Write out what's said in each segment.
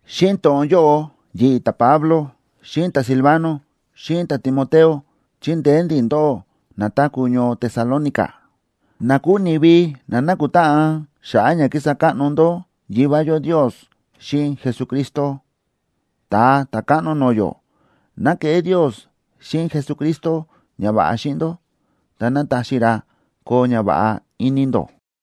Xíꞌin to̱ꞌon yóꞌo yi̱ꞌi̱, ta̱Pablo, xíꞌin ta̱Silvano, xíꞌin ta̱Timoteo, chíndeé ndi̱ ndóꞌó na táku̱ ñoo Tesalónica, na kúu ni̱vi na nákutáꞌan xa̱ꞌa̱ ña kísa káꞌno ndó Yivá yó Ndios xíꞌin Jesucristo, Ta̱a Ta̱káꞌno no̱o̱ yó. ¡Ná keꞌé Ndios xíꞌin Jesucristo ñava̱ꞌa xíꞌin ndó, ta ná taxi ra koo ñava̱ꞌa ini ndó!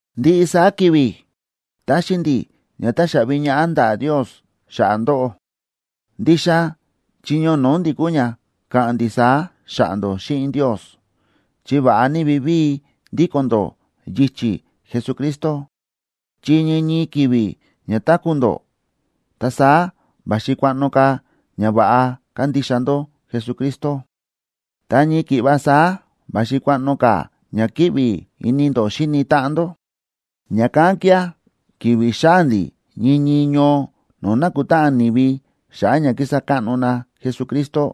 Ndiꞌi saá ki̱vi̱ táxi ndi̱ ña táxaꞌvi ñaꞌá ndaꞌa̱ Ndios xa̱ꞌa̱ ndóꞌó. Ndixa chiño no̱o̱ ndi̱ kúu ña káꞌa̱n ndi̱ saá xa̱ꞌa̱ ndó xíꞌin Ndios, chi va̱ꞌa ní vivíi ndíko̱n ndó yichi̱ Jesucristo. Chi ñii ñii ki̱vi̱ ña táku̱ ndó, ta saá va̱xi kuaꞌno ka̱ ña va̱ꞌa kándixa ndó Jesucristo, ta ñii ki̱ꞌva saá va̱xi kuaꞌno ka̱ ña kíꞌvi ini ndó xíni táꞌan ndó. Ña̱kán kía̱ ki̱vi̱ xáa̱ ndi̱ ñii ñii ñoo no̱o̱ nákutáꞌan ni̱vi xa̱ꞌa̱ ña kísa káꞌno na Jesucristo,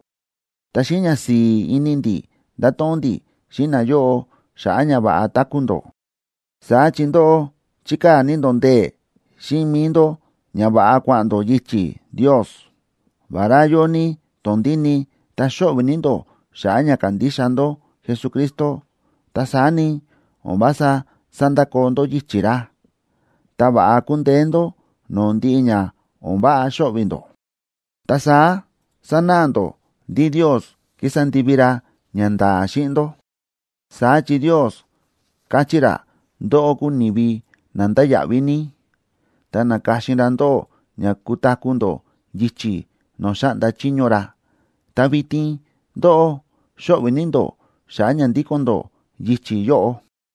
ta xíꞌin ñasi̱i̱ ini ndi̱ ndáto̱ꞌon ndi̱ xíꞌin nayóꞌo xa̱ꞌa̱ ña va̱ꞌa táku̱ ndó. Saá chi ndóꞌó chíkaa̱ ní ndó ndee̱ xíꞌin mi̱i ndó ña va̱ꞌa kua̱ꞌa̱n ndó yichi̱ Ndios. Vará yóo ní tondíni ta xóꞌvi̱ ní ndó xa̱ꞌa̱ ña kándixa ndó Jesucristo, ta saá ni, o̱n vása sándakoo ndó yichi̱ ra, ta va̱ꞌa kúndeé ndó no̱o̱ ndiꞌi ña o̱n váꞌa xóꞌvi̱ ndó. Ta saá sánáꞌa ndó ndí Ndios ki̱sa ndivi ra ñanda̱a̱ xíꞌin ndó. Saá chi Ndios káchí ra ndóꞌó kúu ni̱vi na ndáya̱ꞌví ní, ta na̱ka̱xin ra ndóꞌó ña kutaku̱ ndó yichi̱ no̱o̱ xáꞌnda chiño ra. Ta vitin ndóꞌó xóꞌvi̱ ní ndó xa̱ꞌa̱ ña ndíko̱n ndó yichi̱ yóꞌo.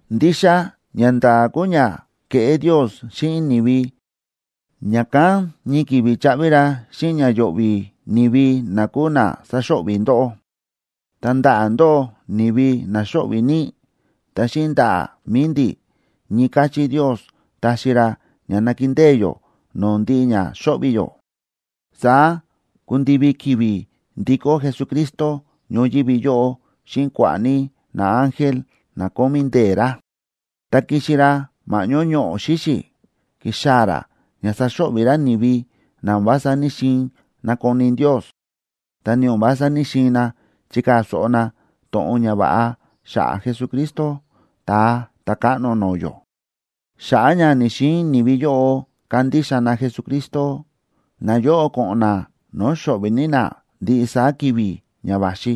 Ndixa ñanda̱a̱ kúu ña kéꞌé Ndios xíꞌin ni̱vi, ña̱kán ñii ki̱vi̱ chaꞌvi ra xíꞌin ña yo̱ꞌvi̱ ni̱vi na kúu na sáxo̱ꞌvi̱ ndóꞌó. Ta ndaꞌa̱ ndóꞌó, ni̱vi na xóꞌvi̱ ní, ta xíꞌin ndaꞌa̱ mi̱i ndi̱, ñii káchí Ndios taxi ra ña nakindée yó no̱o̱ ndiꞌi ña xóꞌvi̱ yó. Saá kundivi ki̱vi̱ ndikó Jesucristo ñoyívi yóꞌo xíꞌin kua̱ꞌa̱ ní naángel na kómí ndee̱ ra, ta kixi ra ma̱ꞌñó ñoꞌo̱ xíxi̱. Kixaa̱ ra ña saxo̱ꞌvi̱ ra ni̱vi na o̱n vása ní‑xiin nakoni Ndios, ta ni o̱n vása ní‑xiin na chikaa̱ so̱ꞌo na to̱ꞌon ñava̱ꞌa xa̱ꞌa̱ Jesucristo, Ta̱a Ta̱káꞌno no̱o̱ yó. Xa̱ꞌa̱ ña ni̱‑xiin ni̱vi yóꞌo kandixa na Jesucristo, nayóꞌo ko̱ꞌo̱n na no̱o̱ xo̱ꞌvi̱ ní na ndiꞌi saá ki̱vi̱ ña va̱xi,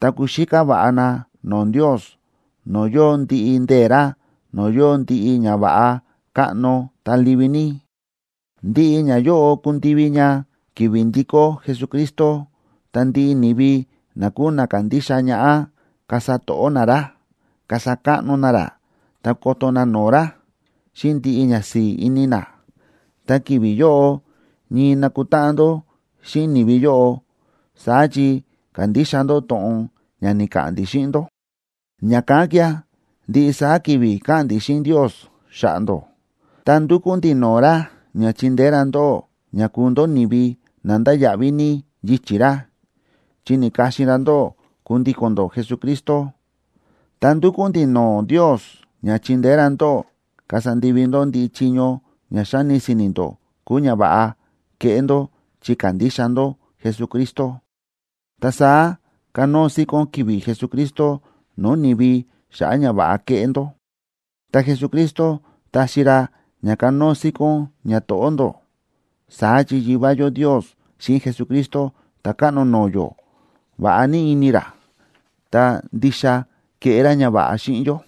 ta kuxíká va̱ꞌa na no̱o̱ Ndios, no̱o̱ yóo ndiꞌi ndee̱ ra, no̱o̱ yóo ndiꞌi ñava̱ꞌa káꞌno, ta livi ní. Ndiꞌi ñayóꞌo kundivi ña ki̱vi̱ ndikó Jesucristo, ta ndiꞌi ni̱vi na kúu na kándixa ñaꞌá, kasa to̱ꞌó na ra, kasa káꞌno na ra, ta koto na no̱o̱ ra xíꞌin ndiꞌi ñasi̱i̱ ini na. Ta ki̱vi̱ yóꞌo ñii nakutáꞌan ndó xíꞌin ni̱vi yóꞌo, saá chi ka̱ndixa ndó to̱ꞌon ña ni̱ka̱ꞌa̱n ndi̱ xíꞌin ndó. Ña̱kán kía̱, ndiꞌi saá ki̱vi̱ káꞌa̱n ndi̱ xíꞌin Ndios xa̱ꞌa̱ ndó. Ta ndúkú ndi̱ no̱o̱ ra ña chindeé ra ndóꞌó ña kuu ndó ni̱vi na ndáya̱ꞌví ní yichi̱ ra, chi ni̱ka̱xin ra ndóꞌó kundíko̱n ndó Jesucristo. Ta ndúkú ndi̱ no̱o̱ Ndios ña chindeé ra ndóꞌó kasa ndivi ndó ndiꞌi chiño ña xáni si̱ni̱ ndó kúu ñava̱ꞌa keꞌé ndó chi kándixa ndó Jesucristo. Ta saá kanóo síkón ki̱vi̱ Jesucristo no̱o̱ ni̱vi xa̱ꞌa̱ ñava̱ꞌa keꞌé ndó, ta Jesucristo taxi ra ña kanóo síkón ñato̱ꞌó ndó, saá chi Yivá yó Ndios xíꞌin Jesucristo Ta̱káꞌno no̱o̱ yó, va̱ꞌa ní ini ra, ta ndixa kéꞌé ra ñava̱ꞌa xíꞌin yó.